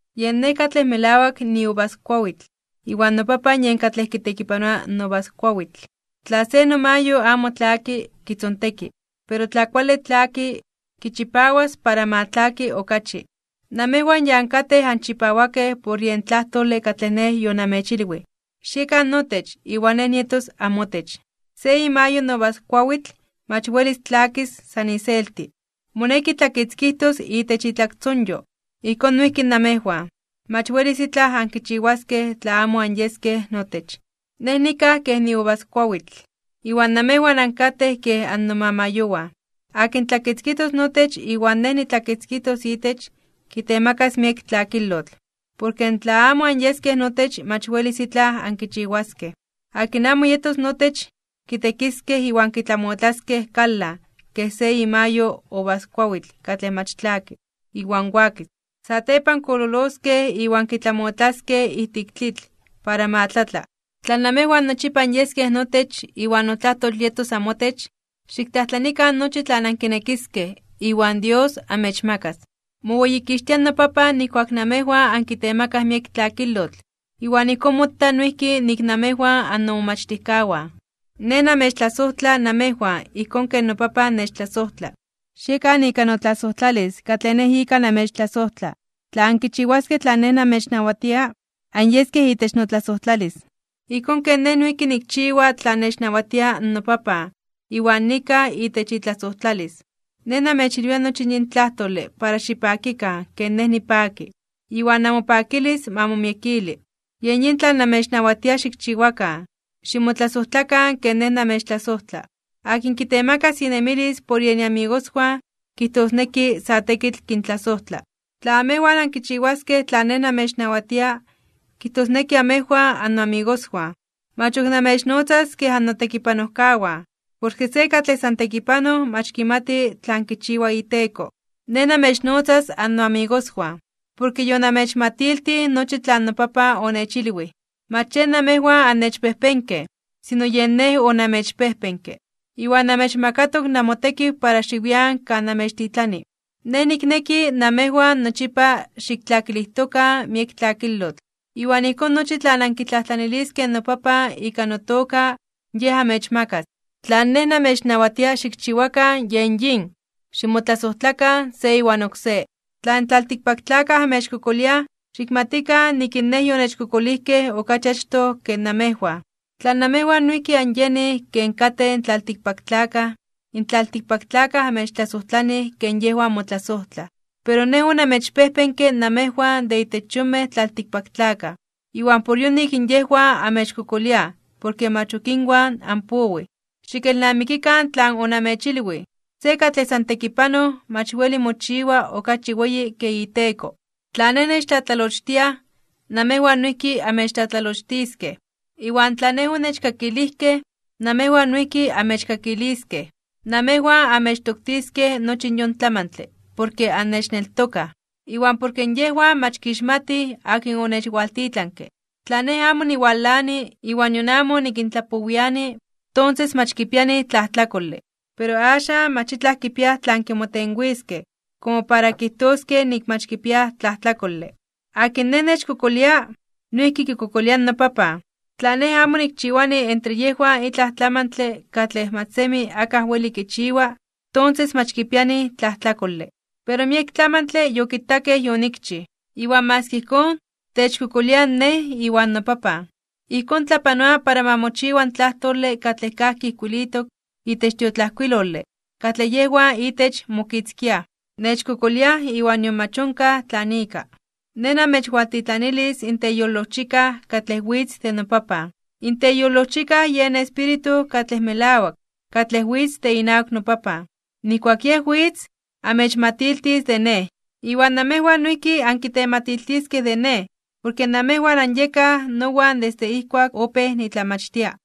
’Yen Nej katlej melawak niuvaskuawitl iwan noPapan yen kitekipanoa in uvaskuawitl. Tla se nomayo amo tlaki, kitzonteki. Pero tla kuale tlaki, kichipawas para ma tlaki okachi. Namejwan ya ankatej anchipawakej por yen tlajtole katlej Nej yonamechilwij. Xiekan notech, iwan Nej nietos amotech. Se imayo in uvaskuawitl mach welis tlakis san iselti. Moneki tlakitzkijtos itech itlaktzonyo. Ijkón noijki namejwan. Mach welis itlaj ankichiwaskej tla amo anyeskej notech. ’Nej nikaj kej niuvaskuawitl, iwan namejwan ankatej kej annomamayowan. Akin tlakitzkijtos notech iwan Nej nitlakitzkijtos itech, kitemakas miek tlakilotl. Porke tla amo anyeskej notech mach welis itlaj ankichiwaskej. Akin amo yetos notech, kitekiskej iwan kitlamotlaskej kalan kej se imayo in uvaskuawitl katlej mach kuale, iwan wakis. Satepan kololoskej iwan kitlamotlaskej ijtik tlitl para ma tlatla. ’Tla namejwan nochipa anyeskej notech, iwan notlajtol yetos amotech, xiktlajtlanikan nochi tlan ankinekiskej, iwan Dios amechmakas. Moweyikixtia noPapan nijkuak namejwan ankitemakaj miek tlakilotl, iwan ijkón mota noijki nik namejwan annomomachtijkawan. Nej namechtlasojtla namejwan ijkón ken noPapan nechtlasojtla. Xiekan ika notlasojtlalis katlej Nej ika namechtlasojtla. Tla ankichiwaskej tlan Nej namechnawatia, anyeskej itech notlasojtlalis. Ijkón ken Nej noijki nikchiwa tlan nechnawatia noPapan iwan nikaj itech itlasojtlalis. ’Nej namechilwia nochi yin tlajtole para xipakikan ken Nej nipaki, iwan namopakilis ma momiekili. Yen yin tlan namechnawatia xikchiwakan: Ximotlasojtlakan ken Nej namechtlasojtla. Akin kitemakas inemilis por yen iamigoswan kijtosneki sa tekitl kintlasojtla. Tla amejwan ankichiwaskej tlan Nej namechnawatia, kijtosneki amejwan annoamigoswan. Mach ok namechnotzas kej annotekipanojkawan, porke se katlej san tekipanoj mach kimati tlan kichiwa iteko. Nej namechnotzas annoamigoswan, porke yonamechmatiltij nochi tlan noPapan onechilwij. Mach yen namejwan annechpejpenkej, sino yen Nej onamechpejpenke. Iwan namechmakatok namotekiw para xiwian kan namechtitlani. Nej nikneki namejwan nochipa xiktlakilijtokan miek tlakilotl. Iwan ijkón nochi tlan ankitlajtlaniliskej noPapan ika notoka, Yej amechmakas. Tlan Nej namechnawatia xikchiwakan yen yin: Ximotlasojtlakan se iwan oksé. ’Tla in tlaltikpaktlakaj amechkokoliaj, xikmatikan nik in Nej yonechkokolijkej okachi achtoj ke namejwan. Tla namejwan noijki anyenij ken katej in antlaltikpaktlakaj, in tlaltikpaktlakaj amechtlasojtlanij ken yejwan motlasojtlaj. Pero Nej onamechpejpenke namejwan de itech yonmej tlaltikpaktlakaj, iwan por yonik yejwan amechkokoliaj porke mach ok inwan anpowij. Xikelnamikikan tlan onamechilwij: “Se katlej san tekipanoj mach weli mochiwa okachi weyi ken iteko.” Tla Nej nechtlatlalochtiaj, namewan noijki amechtlatlalochtiskej. Iwan tla Nej onechkakilijkej, namejwan noijki amechkakiliskej. Namejwan amechtoktiskej nochi yon tlamantle porke annechneltokaj, iwan porke yejwan mach kixmatij akin onechwaltitlanke. ’Tla Nej amo niwalani, iwan nion amo nikintlapowiani, tonses mach kipianij tlajtlakole, pero axan mach itlaj kipiaj tlan kimotenwiskej komo para kijtoskej nik mach kipiaj tlajtlakole. Akin Nej nechkokolia, noijki kikokolia in noPapan. Tla Nej amo nikchiwani entre yejwan itlaj tlamantle katlej mach semi akaj weli kichiwa, tonses mach kipianij tlajtlakole. Pero miek tlamantle yokitakej yonikchij, iwan maski ijkón, techkokoliaj Nej iwan noPapan. Ijkón tlapanoa para ma mochiwa in tlajtole katlej kajki ijkuilitok itech tiotlajkuilole katlej yejwan itech mokitzkiaj: “Nechkokoliaj iwan nion mach onkaj tlan ika.” ’Nej namechwaltitlanilis in Teyolojchikaj katlej witz de noPapan. In Teyolojchikaj yen Espíritu katlej melawak, katlej witz de inawak noPapan. Nijkuak Yej witz, amechmatiltis de Nej. Iwan namejwan noijki ankitematiltiskej de Nej porke namejwan anyekaj nowan desde ijkuak opéj nitlamachtia.